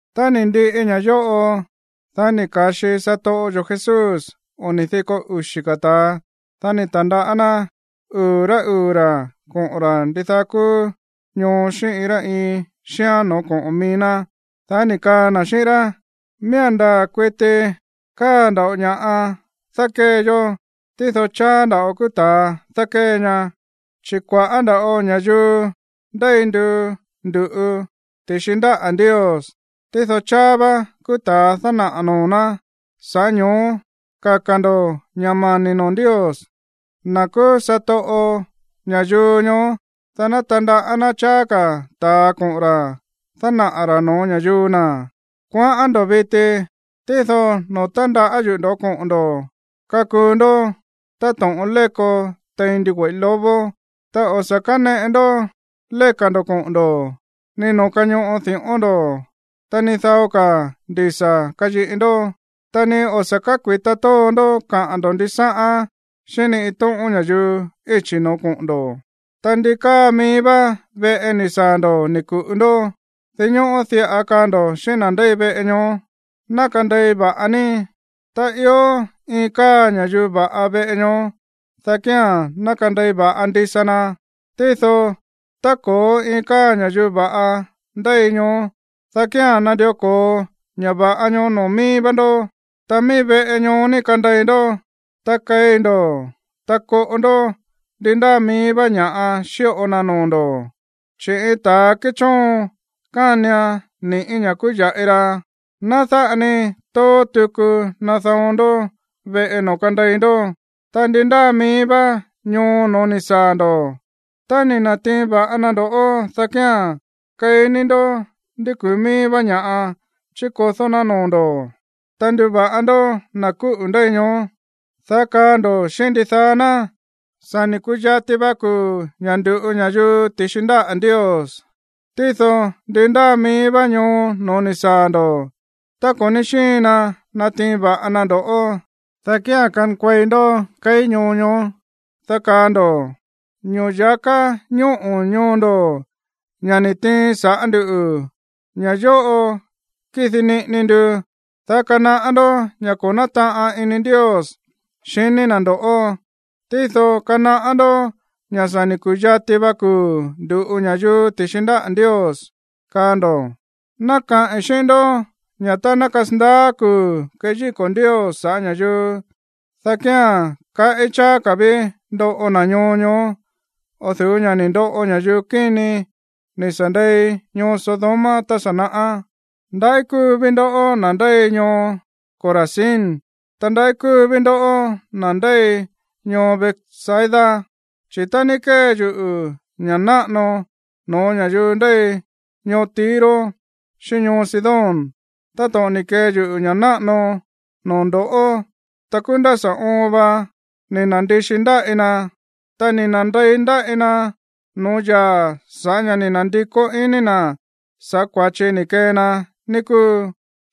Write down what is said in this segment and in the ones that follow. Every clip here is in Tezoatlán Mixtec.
Tá ni̱ ndiꞌi ña̱ yóꞌo, dá ni̱ ka̱xi satoꞌo yo̱ Jesús oni̱ diko uxi̱ ka̱ ta̱a. Dá ni̱ ta̱ndaꞌá ná uu̱ rá uu̱ ra̱ koꞌo̱n ra̱ ndidaá kúú ñoo xíꞌín iin rá iin xíán no̱ó koꞌo̱n mií ná. Dá ni̱ kaa na̱ xíꞌín rá: ―Miía̱n ndaa̱ kuiti káa nda̱ꞌo ña̱ꞌa dákée yó, tído cháá nda̱ꞌo kúú ta̱a dákée ña, chi̱ kua̱ꞌá nda̱ꞌo ña̱yuu ndéi nduu ndu̱ꞌu ti̱xi ndáꞌa̱ Ndios, tído cháá vá kúú ta̱a dánaꞌa̱ noo̱ ná. Sa̱ꞌá ño̱ó kaka̱ ndo̱ ña̱ mani̱ noo̱ Ndios, na̱ kúú satoꞌo ña̱yuu ñoó, dá ná tandaꞌá ná cháá ka̱ ta̱a koꞌo̱n ra̱ dánaꞌa̱ ra̱ no̱ó ña̱yuu na̱. Kuaꞌán ndo̱ꞌó viti, tído noo̱ tándaꞌá yuꞌu̱ ndo̱ꞌó koꞌo̱n ndo̱ kakuu ndó táto̱ꞌon léko tein ndigüe̱ꞌí lobo. Ta o̱ sa̱ káneꞌe ndó léka̱ ndo̱ koꞌo̱n ndo̱, ni noo̱ kañoꞌo di̱ꞌón ndo̱, ta ni dao ka̱ ndisa̱ kayiꞌi ndó, ta ni o̱ sa̱ kákui̱ta tóo ndó kaꞌa̱n ndo̱ ndisáꞌán xíꞌín ni iin tóꞌón ña̱yuu íchi̱ no̱ó koꞌo̱n ndo̱. Ta ndi káa mií vá veꞌe ni̱ saa̱ ndo̱ ni̱ ku̱ꞌu ndó, dinñóꞌó diꞌa kaa ndo̱ xíꞌín na̱ ndéi veꞌe ñoó: “Ná kandei va̱ꞌa ní.” Tá ió iin káa ña̱yuu va̱ꞌa veꞌe ñoó, dá kía̱n ná kandei va̱ꞌa ndisa na. Tído tá ko̱ó iin káa ña̱yuu va̱ꞌa ndéi ñoó, dá kía̱n nandió ko̱o ña̱ va̱ꞌa ñoó noo̱ mií vá ndó. Ta mií veꞌe ñoó ní kandei ndó. Ta keí ndó, ta koꞌo ndó ndi ndáa mií vá ña̱ꞌa xíꞌo na noo̱ ndo̱. Chi̱ iin ta̱ kéchoon kánian ni̱ꞌí ña̱ kúú ya̱ꞌi ra. Ná dáꞌa ni tóó tuku nada̱on ndó veꞌe noo̱ kandei ndó. Ta ndi ndáa mií vá ñoo no̱ó ni̱ saa̱ ndo̱, ta ni̱ na̱tiin va̱ꞌa na ndo̱ꞌó, dá kía̱n keí ní ndó ndi kúú mií vá ña̱ chikodó ná noo̱ ndo̱, ta nduva̱ꞌa ndó na̱ kúꞌu̱ ndéi ñoó, dá kaa ndo̱ xíꞌín ndidaá ná: “Sa̱ ni̱ ku̱yati va kuu̱ ña̱ ndu̱ꞌu ña̱yuu ti̱xi ndáꞌa̱ Ndios.” Tído ndi ndáa mií vá ñoo no̱ó ni̱ saa̱ ndo̱, ta ko̱ ní xíin na natiin va̱ꞌa na ndo̱ꞌó, dá kía̱n kankuei ndó keí ñoo ñoó, dá kaa ndo̱: “Ño̱ya̱ká ñóꞌo ñoo ndo̱, ña̱ ni̱ tiin saꞌa̱ ndú, ña̱ yóꞌo kidi niꞌini ndu, dá kanaꞌá ndó ña̱ ko̱ nátaꞌan ini Ndios xiní na̱ ndo̱ꞌó. Tído kanaꞌá ndó ña̱ sa̱ ni̱ ku̱yati va kuu̱ ndu̱ꞌu ña̱yuu ti̱xi ndáꞌa̱ Ndios”, kaa ndo̱. Ná kaꞌi̱n xíꞌín ndó ña̱ tá ná kasandaá kuu̱ keyíko̱ Ndios sa̱ꞌá ña̱yuu, dá kía̱n kaꞌí cháá ka̱ ví ndoꞌo na̱ ñoo ñoó o̱ du̱ú ña̱ ni̱ ndoꞌo ña̱yuu kíni ni̱ sa̱ ndei ñoo Sodoma tá sa̱ naꞌá. ’¡Ndaꞌí kúu ví ndo̱ꞌó, na̱ ndéi ñoo Corazín! Ta, ¡ndaꞌí kúu ví ndo̱ꞌó, na̱ ndéi ñoo Betsaida! Chi̱ tá ní kée yuꞌu̱ ña̱ náꞌano no̱ó ña̱yuu ndéi ñoo Tiro xíꞌín ñoo Sidón táto̱ꞌon ni̱ kee yuꞌu̱ ña̱ náꞌano noo̱ ndo̱ꞌó, ta kúú nda̱ sa̱ oon va ni̱ na̱ndixi ndaꞌí na̱, ta ni̱ na̱nde̱i ndaꞌí na̱ noo̱ yaa̱ sa̱ꞌá ña̱ ni̱ na̱ndikó iní na̱ sa̱ꞌá kua̱chi ni̱ kee na, ní kúu.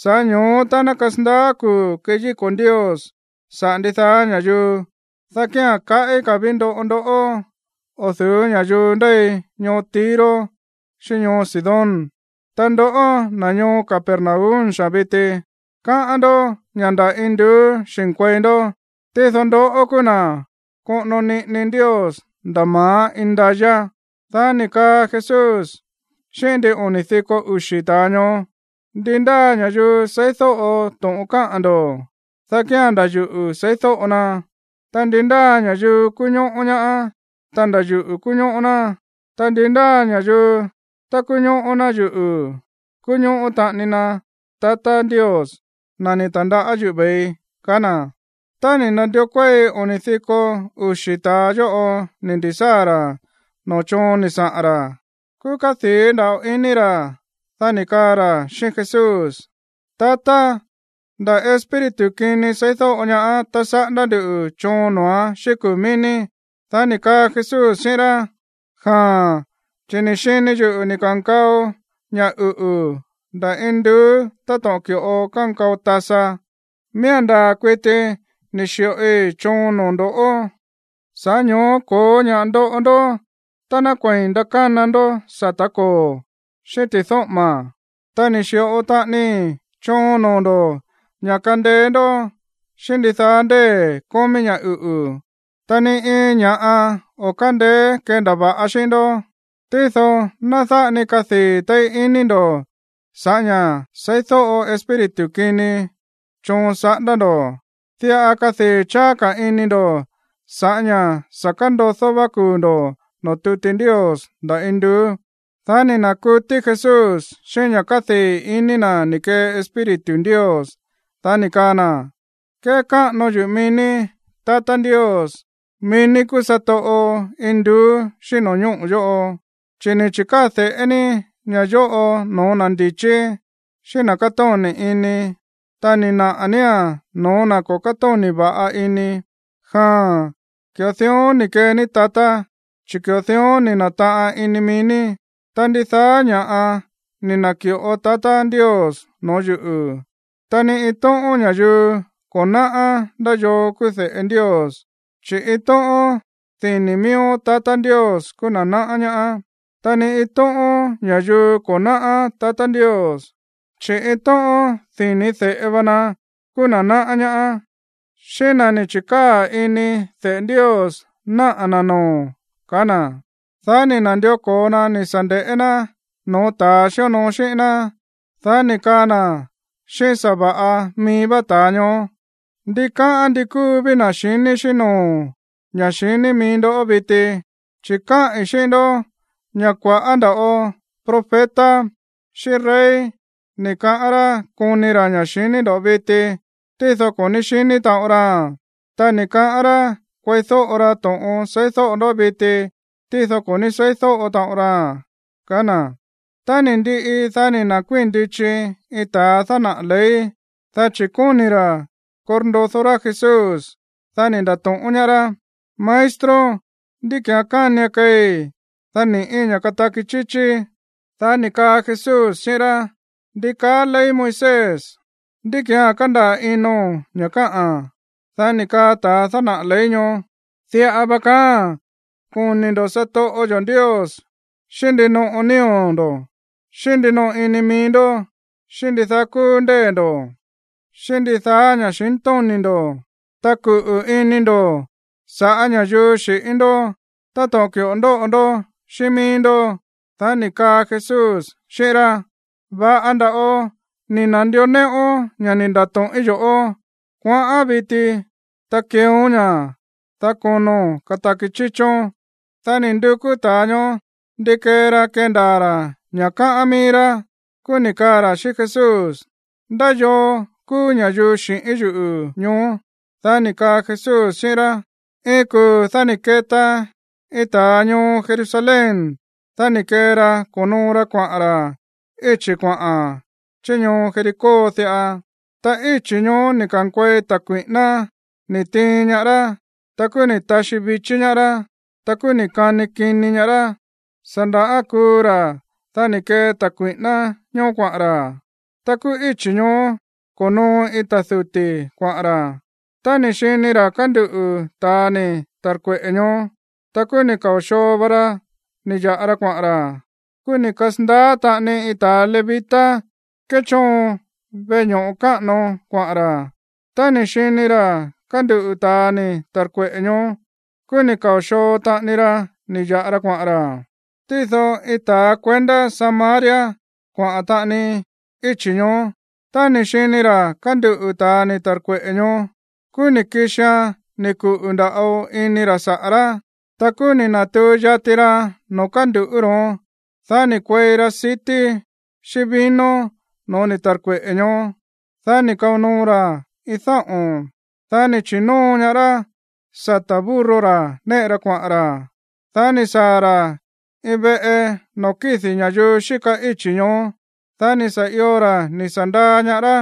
Sa̱ꞌá ño̱ó tá ná kasandaá kuu̱ keyíko̱ Ndios saꞌa̱ ndidaá ña̱yuu, dá kía̱n kaꞌí ka̱ ví ndoꞌo ndoꞌó o̱ du̱ú ña̱yuu ndéi ñoo Tiro xíꞌín ñoo Sidón. Ta ndoꞌó, na̱ ñoo Capernaum xaa̱n viti, káꞌán ndó ña̱ nda̱ induú xi̱nkuei ndó. Tído ndoꞌó kúú na̱ koꞌono niꞌini Ndios nda̱ ma̱á indayá. Dá ni̱ kaa Jesús xíꞌín ndin oni̱ diko uxi̱ ta̱a ñoó: ―Ndi ndáa ña̱yuu seídóꞌo to̱ꞌon káꞌa̱n ndo̱, dá kía̱n nda̱ yuꞌu̱ seídóꞌo na. Ta ndi ndáa ña̱yuu kuñóꞌó ñaá, ta nda̱ yuꞌu̱ kuñóꞌó ná. Ta ndi ndáa ña̱yuu, tá kuñóꞌó ná yuꞌu̱, kuñóꞌó taꞌani na tatá Ndios, na̱ ni̱ ta̱ndaꞌá yuꞌu̱ ve̱ii ―kaá na̱. Tá ni̱ na̱ndió kuéi oni̱ diko uxi̱ ta̱a yóꞌo ni̱ ndi̱sáa̱ ra̱ noo̱ choon ni̱ saꞌa̱n ra̱, kúú kádii̱ nda̱ꞌo ini ra̱. Dá ni̱ kaa ra̱ xíꞌín Jesús: ―Tatá, nda̱ espíritu kini seídóꞌo ñaá tá saꞌándá ndu̱ choon noo̱án xíꞌín kuu̱ mií ní. Dá ni̱ kaa Jesús xíꞌín rá: ―Jaa̱n, chi̱ ni̱ xini yuꞌu̱ ni̱ ka̱nkao ña̱ uꞌu̱ nda̱ induú táto̱ꞌon ki̱ꞌo kánkao tasa. Miía̱n ndaa̱ kuiti ni̱ xi̱ꞌoi choon noo̱ ndo̱, sa̱ꞌá ño̱ó ko̱ó ña̱ꞌa ndoꞌo ndó tá ná kuei̱n nakána ndó sa̱tá koo̱, xíꞌín ti̱dóꞌo̱ma̱. Ta ni̱ xi̱ꞌo taꞌanii choon noo̱ ndo̱ ña̱ kandeé ndó xíꞌín ndidaá ndée̱ kómí ña̱ uꞌu̱, ta ni iin ña̱ꞌa o̱ kándeé kendava̱ꞌan xíꞌín ndó. Tído ná dáꞌa ni kadii̱ téí ini ndo̱ sa̱ꞌá ña̱ seídóꞌo espíritu kini choon saꞌándá ndo̱. Diꞌa kadii̱ cháá ka̱ ini ndo̱ sa̱ꞌá ña̱ sa̱ kándodó vá kuu̱ ndo̱ noo̱ tuti Ndios nda̱ induú. Dá ni̱ na̱kutí Jesús xíꞌín ña̱ kádii̱ ini na̱ ni̱ kee Espíritu Ndios, dá ni̱ kaa na̱: ―Kékáꞌano yuꞌu̱ mií ní, tatá Ndios, mií ní kúú satoꞌo induú xíꞌín no̱ñóꞌo̱ yóꞌo, chi̱ ni̱ chi̱káa̱ de̱ꞌé ní ña̱ yóꞌo no̱ó na̱ ndi̱chí, xíꞌín na̱ kátóni̱ ini. Ta ni̱ naꞌa̱ nía̱n no̱ó na̱ ko̱ kátóni̱ va̱ꞌa ini. Jaa̱n, ki̱ꞌo dión ni̱ kee ní, tatá, chi̱ ki̱ꞌo dión ni̱ na̱taꞌan ini mií ní. ’Ta ndidaá ña̱ꞌa ni̱ na̱ki̱ꞌo tatá Ndios no̱ó yuꞌu̱. Ta ni iin tóꞌón ña̱yuu ko̱ náꞌá ndá yoo kúú de̱ꞌe Ndios, chi̱ iin tóꞌón dini̱ miíó tatá Ndios kúú na̱ náꞌá ñaá. Ta ni iin tóꞌón ña̱yuu ko̱ náꞌá tatá Ndios, chi̱ iin tóꞌón dini̱ de̱ꞌe va na kúú na̱ náꞌá ñaá, xíꞌín na̱ ni̱ chi̱kaa̱ ini de̱ꞌe Ndios naꞌa̱ na̱ noo̱ ―kaá na̱. Dá ni̱ na̱ndió ko̱o na ni̱ sa̱ nde̱ꞌé ná no̱ó ta̱a xíonoo xíꞌín ná, dá ni̱ kaa na̱ xíꞌín sa̱va̱ꞌa mií vá ta̱a ñoó: ―Ndikáꞌán ndi kúu ví na̱ xiní xíꞌín no̱ó ña̱ xiní mií ndó viti. Chi̱ káꞌi̱n xíꞌín ndó ña̱ kua̱ꞌá ndava̱ꞌo profeta xíꞌín rey ni̱ kaꞌán rá koni ra̱ ña̱ xiní ndoꞌó viti, tído ko̱ ní xiní taꞌon raa̱n. Ta ni̱ kaꞌán rá kueídóꞌo ra to̱ꞌon seídóꞌo ndó viti, tído ko̱ ní seídóꞌo taꞌon raa̱n ―kaá na̱. Tá ni̱ ndiꞌi, dá ni̱ na̱kuíi̱n ndichi iin ta̱a dánaꞌa̱ ley, dá chi̱ kóni̱ ra̱ korndodó rá Jesús. Dá ni̱ nda̱to̱ꞌón ñaá rá: ―Maestro, ¿ndí ki̱án kánian keei, dá ni̱ꞌí ña̱ kataki chíchíí? Dá ni̱ kaa Jesús xíꞌín rá: ―¿Ndi kaá ley Moisés? ¿Ndí ki̱án kándaa̱ ino̱n ña̱ káꞌa̱n? Dá ni̱ kaa ta̱ dánaꞌa̱ ley ñoó: ―Diꞌa va kaáa̱n: “Koni̱ ndo̱ satoꞌo yo̱ Ndios xíꞌín ndinoꞌo nío̱ ndo̱, xíꞌín ndinoꞌo ini mií ndó, xíꞌín ndidaá kúú ndée̱ ndo̱, xíꞌín ndidaá ña̱xintóni̱ ndo̱. Ta kuꞌu̱ ini ndo̱ sa̱ꞌá ña̱yuu xi̱ꞌín ndó táto̱ꞌon ki̱ꞌo ndóꞌo ndó xíꞌín míí ndó.” Dá ni̱ kaa Jesús xíꞌín rá: ―Va̱ꞌa nda̱ꞌo ni̱ na̱ndió néꞌón ña̱ ni̱ nda̱to̱ꞌín yo̱ꞌó. Kuaꞌán viti, ta keeón ña̱, dá kono̱n kataki chíchón. Dá ni̱ ndukú ta̱a ñoó ndi kee ra kendaa̱ ra̱ ña̱ káꞌán mií rá. Kúú ni̱ kaa ra̱ xíꞌín Jesús: ―¿Ndá yoo kúú ña̱yuu xi̱ꞌín yuꞌu̱ ñoó? Dá ni̱ kaꞌa̱n Jesús xíꞌín rá: ―Iin kuu̱ dá ni̱ keta iin ta̱a ñoo Jerusalén. Dá ni̱ kee ra ko̱noo ra kuaꞌa̱n ra̱ íchi̱ kuaꞌa̱n chí ñoo Jericó diꞌa. Ta íchi̱ ñoó ni̱ ka̱nkuei ta̱ kui̱ꞌíná ni̱ tiin ñaá rá. Kúú ni̱ taxí vichí ñaá rá. Ta kúú ni̱ kani kini ñaá rá. Sa̱ nda̱ kuu ra̱. Dá ni̱ kee ta̱ kui̱ꞌíná ñóó kuaꞌa̱n ra̱. Ta kúú íchi̱ ñoó ko̱noo iin ta̱ duti̱ kuaꞌa̱n ra̱. Tá ni̱ xini ra̱ kánduꞌu̱ ta̱a ni̱ ta̱rkueꞌe̱ ñoó, ta kúú ni̱ kao̱ xoo va ra ni̱ ya̱ꞌa ra kuaꞌa̱n ra̱. Kúú ni̱ kasa̱ndaá taꞌani iin ta̱a levita kéchóon veꞌe ño̱ꞌo káꞌano kuaꞌa̱n ra̱. Tá ni̱ xini ra̱ kánduꞌu̱ ta̱a ni̱ ta̱rkueꞌe̱ ñoó, kúú ni̱ kao̱ xoo taꞌani ra ni̱ ya̱ꞌa ra kuaꞌa̱n ra̱. Tído iin ta̱a kuendá Samaria kuaꞌa̱n taꞌani íchi̱ ñoó. Tá ni̱ xini ra̱ kánduꞌu̱ ta̱a ni̱ ta̱rkueꞌe̱ ñoó, kúú ni̱ kixian ni̱ kuꞌu̱ nda̱ꞌo ini ra̱ saꞌa̱ rá. Ta kúú ni̱ na̱tuu yati ra noo̱ kánduꞌu̱ ro̱ón. Dá ni̱ kuei ra sití xíꞌín vino no̱ó ni̱ ta̱rkueꞌe̱ ñoó, dá ni̱ kao noo ra̱án iin dáꞌo̱n. Dá ni̱ chi̱nóo ñaá rá sata̱ burro ra̱ néꞌe ra kuaꞌa̱n ra̱. Dá ni̱ saa̱ ra̱ iin veꞌe noo̱ kídi̱ ña̱yuu xíka íchi̱ ñoó. Dá ni̱ sa̱ io ra̱ ni̱ sa̱ ndaa ñaá rá.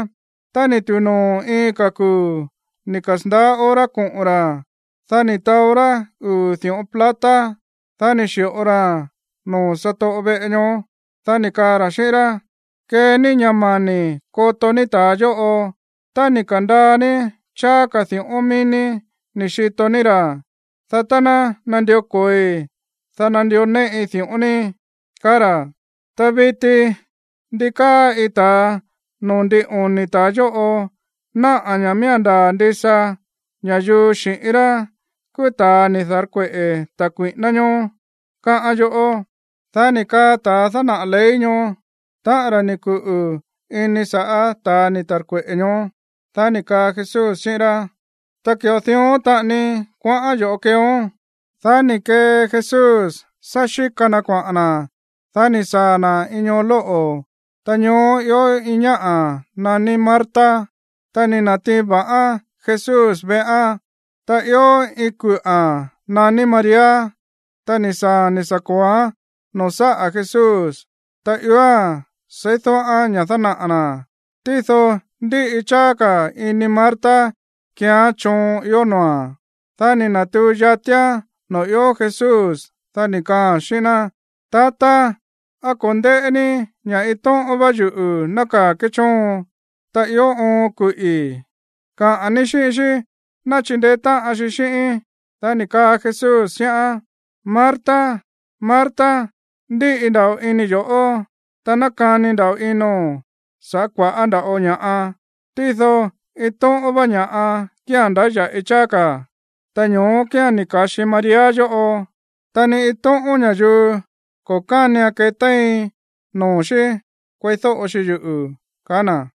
Tá ni̱ tu̱u noo̱ iin ka̱ kuu̱ ni̱ kasa̱ndaá hora koꞌo̱n ra̱. Dá ni̱ taó rá uu̱ di̱ꞌón plata, dá ni̱ xi̱ꞌo raa̱n noo̱ satoꞌo veꞌe ñoó. Dá ni̱ kaa ra̱ xíꞌín rá: “Kee ní ña̱ mani̱ koto ní ta̱a yóꞌo. Tá ni̱ ka̱ndaa ní cháá ka̱ di̱ꞌón mií ní ni̱ xito ní ra̱, dá tá ná nandió ko̱oi, dá nandió néꞌi di̱ꞌón ní”, kaá ra̱. Ta viti, ¿ndí káa iin ta̱a noo̱ ndin oni̱ ta̱a yóꞌo náꞌa̱ ña̱ miía̱n ndaa̱ ndisa ña̱yuu xi̱ꞌín rá kúú ta̱a ni̱ da̱rkueꞌe̱ ta̱ kui̱ꞌíná ñóó, káꞌán yoꞌó? Dá ni̱ kaa ta̱ dánaꞌa̱ ley ñoó: ―Táꞌa̱n ra̱ ni̱ kuꞌu̱ ini sa̱ꞌá ta̱ ni̱ ta̱rkueꞌe̱ ñoó. Dá ni̱ kaa Jesús xíꞌín rá: ―Ta ki̱ꞌo dión taꞌani kuaꞌán yo̱ꞌó keeón. Dá ni̱ kee Jesús sá xíka na kuaꞌa̱n na̱. Dá ni̱ saa̱ na̱ iin ñoo lóꞌo̱, ta ñoó ió iin ñáꞌa̱ naní Marta. Ta ni̱ na̱tiin va̱ꞌán Jesús veꞌán. Ta ió iin kuꞌa̱n naní María, ta ni̱ saa̱a̱n ni̱ sa̱ ko̱oán noo̱ sáꞌa̱ Jesús, ta ióa̱n seídóꞌán ña̱ dánaꞌa̱ na̱. Tído ndíꞌi cháá ka̱ ini Marta kéeán choon ió noo̱a̱n. Dá ni̱ na̱tuu yatián noo̱ ió Jesús, dá ni̱ kaaa̱n xíꞌín ná: ―Tatá, ¿á ko̱ ndéꞌé ní ña̱ iin tóꞌón vá yuꞌu̱ nákaa̱ kéchóon, ta ió oon kuꞌi̱? Kaꞌa̱n ní xíꞌín xí ná chindeé táꞌan xi xíꞌíín. Dá ni̱ kaa Jesús xíꞌán: ―Marta, Marta. Ndíꞌi nda̱ꞌo ini yo̱ꞌó, ta nákani ino̱n sa̱ꞌá kua̱ꞌá nda̱ꞌo ña̱ꞌa. Tído iin tóꞌón vá ña̱ꞌa kía̱n ndáya̱ꞌi cháá ka̱. Ta ño̱ó kía̱n ni̱ ka̱xi María yóꞌo, ta ni iin tóꞌón ña̱yuu ko̱ kánian ketéin noo̱ xí kueídóꞌo xi yuꞌu̱ ―kaá na̱.